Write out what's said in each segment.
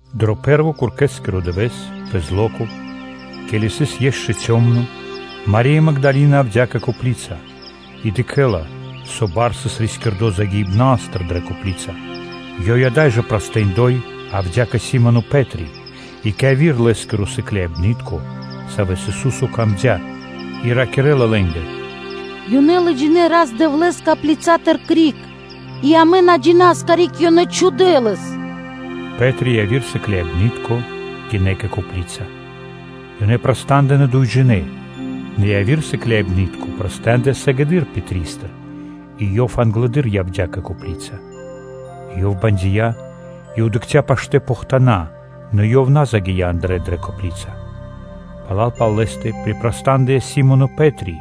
Дро пэ́рво куркэскиро дывэ́с, пэ зло́ко, ке́ли сыс ишчо (инкэ́) кало́ (цёмно), Мари́я Магдалина явдя́ кэ копли́ца, и дыкхэ́ла, со бар сыс рискирдо загиибнастыр дрэ копли́ца. Ёй ада́й жэ прастындой явдя́ кэ Си́моно Пэ́три и кэ яви́р Лэ́скиро сыкляибны́тко, саво́ сыс дро́го Исусо́скэ, и ракирэ́ла лэ́нгэ: “Ёнэ лыджинэ́ Рас-Дэвлэ́с коплицатыр криг, и амэ на джина́са, карик ёнэ чхудэ́ Лэс.” Пэ́три и яви́р сыкляибны́тко гинэ́ кэ копли́ца. Ёнэ праста́ндынэ дуйджинэ́; нэ яви́р сыкляибны́тко праста́ндыя сыгэды́р Пэтристыр и ёв англэды́р явдя́ кэ копли́ца. И ёв бандия и дыкхця́ паштэ́ похтана, нэ ёв на загия́ андрэ́ дрэ копли́ца. Пала́л пал лэ́стэ припрастандыя Си́моно Пэ́три,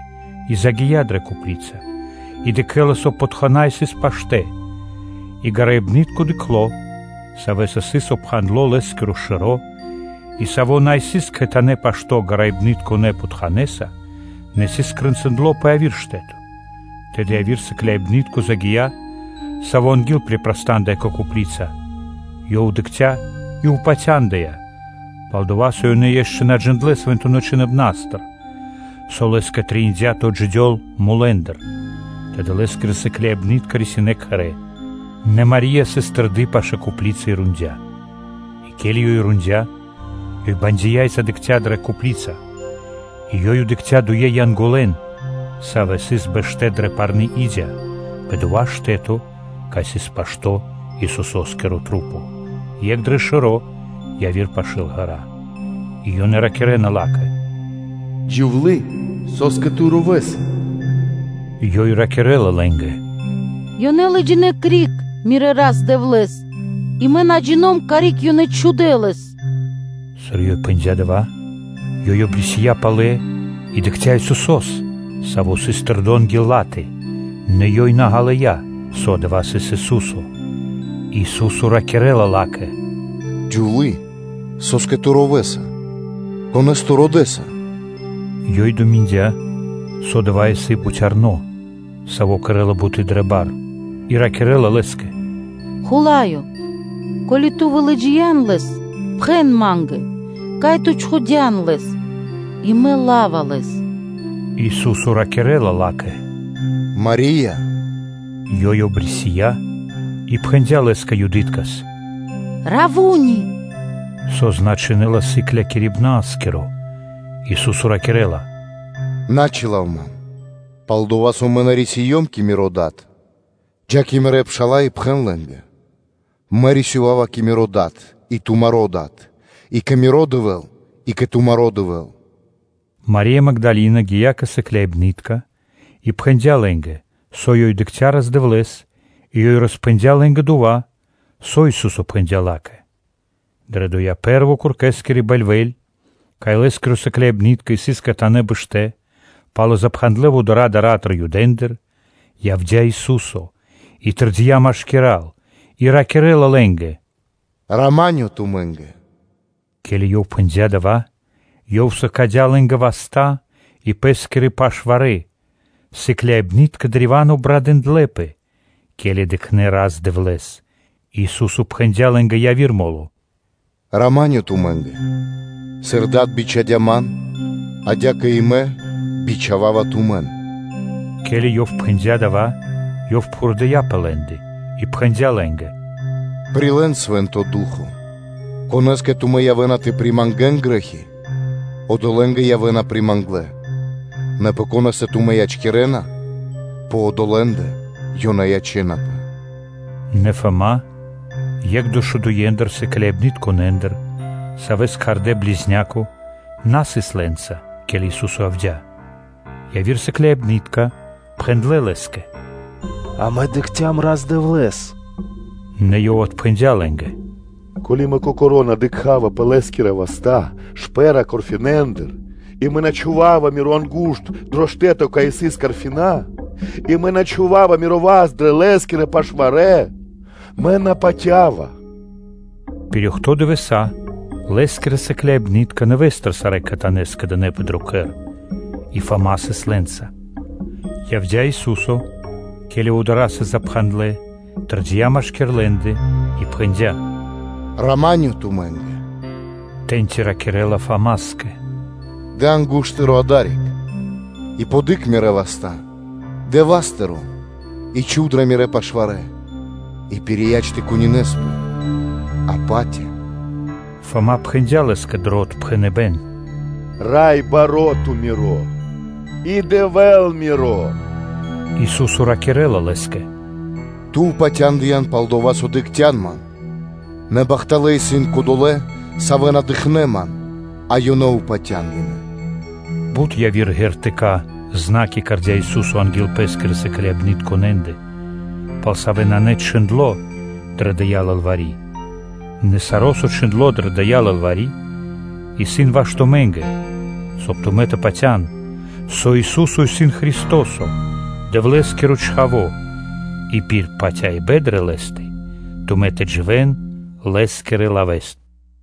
и загия́ дрэ копли́ца, и дыкхэ́ла, со похтана сыс паштэ́, и гараибнытко дыкхло, савэ́са сыс обпхандло Лэ́скиро шэро́, и саво́ на сыс кхэтанэ́ пашто́ гараибнытконэ похтанэса, нэ сыс скрэнцындло пэ яви́р штэ́то. Тэды и яви́р сыкляибны́тко загия́, саво́ анги́л припрастандыя кэ копли́ца, ёв дыкхця́, и упатяндыя; пал-дова́ со ёнэ ешчэ на джиндлэ́ Свэнтонэ́ Чхиныбна́стыр, со Лэ́скэ трэиндя́ тэ отджидёл мулэ́ндыр. Тэды Лэ́скирэ сыкляибны́тка рисинэ́ кхэрэ́. Нэ Мари́я сыс тэрды пашы́л копли́ца и рондя́. И ке́ли ёй рондя́, ёй бандия и задыкхця дрэ копли́ца, и ёй дыкхця́ дуе́н Янголэн, савэ́ сыс бэштэ́ дрэ парны и́дя пэ дова́ штэ́то, кай сыс пашто́ Исусо́скиро тру́по, екх дрэ шэро́, яви́р пашы́л ґэра́. И ёнэ ракирэ́на ла́кэ: “Джувлие! Со́скэ ту ровэса?” Ёй ракирэ́ла лэ́нгэ: “Ёнэ лыджинэ́ криг мирэ́ Рас-Дэвлэ́с, и мэ на джино́м, карик ёнэ чхудэ́ Лэс.” Сыр ёй пхэндя́ дава́, ёй обрисия палэ и дыкхця́ Исусо́с, Саво́ сыс тэрдо́ анги́л ла́тэ; нэ ёй на ґалыя́, со дава́ сыс Ису́со. Ису́со ракирэ́ла ла́кэ: “Джувлие! Со́скэ ту ровэса? Конэ́с ту родэса?” Ёй думиндя, со дава́ исын бутярно, саво́ кэрэ́ла буты́ дрэ бар, и ракирэ́ла Лэ́скэ: “Хула́ё! Ко́ли (со) ту вылыджиян Лэс, пхэн ма́нгэ, кай ту чхудя́н Лэс, и мэ ла́ва Лэс.” Ису́со ракирэ́ла ла́кэ: “Марие!” Ёй обрисия и пхэндя́ Лэ́скэ юдыткэс: “Раввуни!” (со значынэ́ла “Сыклякирибна́скиро!”) Ису́со ракирэ́ла: “На чилав Ман, пал-дова́ со Мэ на рисиём кэ Миро Дад; джа́ кэ Мирэ́ пша́ла и пхэн лэ́нгэ: “Мэ рисёва́ва кэ Миро Дад и тумаро́ Дад и кэ Миро Дэвэ́л и кэ тумаро́ Дэвэ́л”.” Мари́я Магдалина гия́ кэ сыкляибны́тка и пхэндя́ лэ́нгэ, со ёй дыкхця́ Рас-Дэвлэ́с и ёй роспхэндя́ лэ́нгэ дова́, со Ису́со пхэндя́ ла́кэ. Дрэ доя́ пэ́рво куркэскири бэльвэ́ль, кай Лэ́скирэ сыкляибны́тка сыс кхэтанэ́ бэштэ́ палэ запхандлэ вудара́ дара́тыр Юдэндыр, явдя́ Ису́со, и тэрдия́ машкира́л, и ракирэ́ла лэ́нгэ: “Рама́нё (миро) тумэ́нгэ!” Ке́ли Ёв пхэндя́ дава́, Ёв сыкадя́ лэ́нгэ васта́ и Пэ́скирэ пашварэ. Сыкляибны́тка древа́н обрадындлэпэ, ке́ли дыкхнэ́ Рас-Дэвлэ́с. Ису́со пхэндя́ лэ́нгэ яви́р мо́ло: “Рама́нё тумэ́нгэ! Сыр Дад бичхадя́ Ман, адя́кэ и Мэ бичхава́ва тумэн.” Ке́ли Ёв пхэндя́ дава́, Ёв пхурдыя пэ лэ́ндэ и пхэндя́ лэ́нгэ: “Прилэ́н Свэ́нто Ду́хо (Фа́но): конэ́скэ тумэ́ явэ́на тэ примангэн грэ́хи, одолэ́нгэ явэ́на приманглэ, нэ пэ конэ́стэ тумэ́ ячкирэна, пэ одолэ́ндэ ёнэ ячэ́напэ.” О Фама́, екх дэшэдуендыр сыкляибнытконэндыр, савэ́с кхардэ́ “Близняко”, на сыс лэ́нца, ке́ли Ису́со явдя́. Яви́р сыкляибны́тка пхэндлэ́ лэ́скэ: “Амэ дыкхцям Рас-Дэвлэ́с.” Нэ ёв отпхэндя́ лэ́нгэ: “Ко́ли (со) мэ на дыкха́ва шпэ́ра гвоздэндыр (карфинэндыр) пэ Лэ́скирэ васта́, и мэ на чхува́ва миро ангу́шт дро штэ́то, кай сыс гвозды (карфина), и мэ на чхува́ва миро васт дрэ Лэ́скирэ пашварэ, Мэ на упатява.” Пир охто́ (бидуе́нгиро дэш) дывэса́ Лэ́скирэ сыкляибны́тка нэвэ́стыр сарэ́ кхэтанэ́ скэдынэ́пэ дро кхэр, и Фама сыс лэ́нца. Явдя́ Ису́со, ке́ли вудара́ сыс запхандлэ, тэрдия́ машки́р лэ́ндэ, и пхэндя́: “Рама́нё тумэ́нгэ!” Тэ́ньци ёв ракирэ́ла Фамаскэ: “Дэ ангу́шт (пальцо) тыро́ адари́к и подыкх Мирэ́ васта́; дэ васт тыро́ и чхув дрэ Мирэ́ пашварэ; и пирияч тэ кунинэспэ, а патя.” Фама пхэндя́ Лэ́скэ дро отпхэныбэ́н: “Раё Дэ́вла миро и Дэвэ́л миро!” Ису́со ракирэ́ла лэ́скэ: “Ту патяндыян, пал-дова́ со ту дыкхця́н Ман: нэ бахталэ́ исын кодолэ́, савэ́ на дыкхнэ́ Ман, а ёнэ упатя́ндынэ.” Бут яви́р знаме́нии (ґертыка́) кэрдя́ Ису́со анги́л Пэ́скирэ сыкляибнытконэндэ, пал савэ́ нанэ чхиндло́ дрэ дая́ лылвари́; нэ саро́, со сыс чхиндло́ дрэ дая́ лылвари́, исын ваш тумэ́нгэ, соб (кай) тумэ́ тэ патя́н, со Ису́со исын Христо́со, Дэвлэ́скиро Чхаво́, и пир патяибэ́н дрэ Лэ́стэ, тумэ́ тэ дживэ́н Лэ́скирэ лавэ́стыр.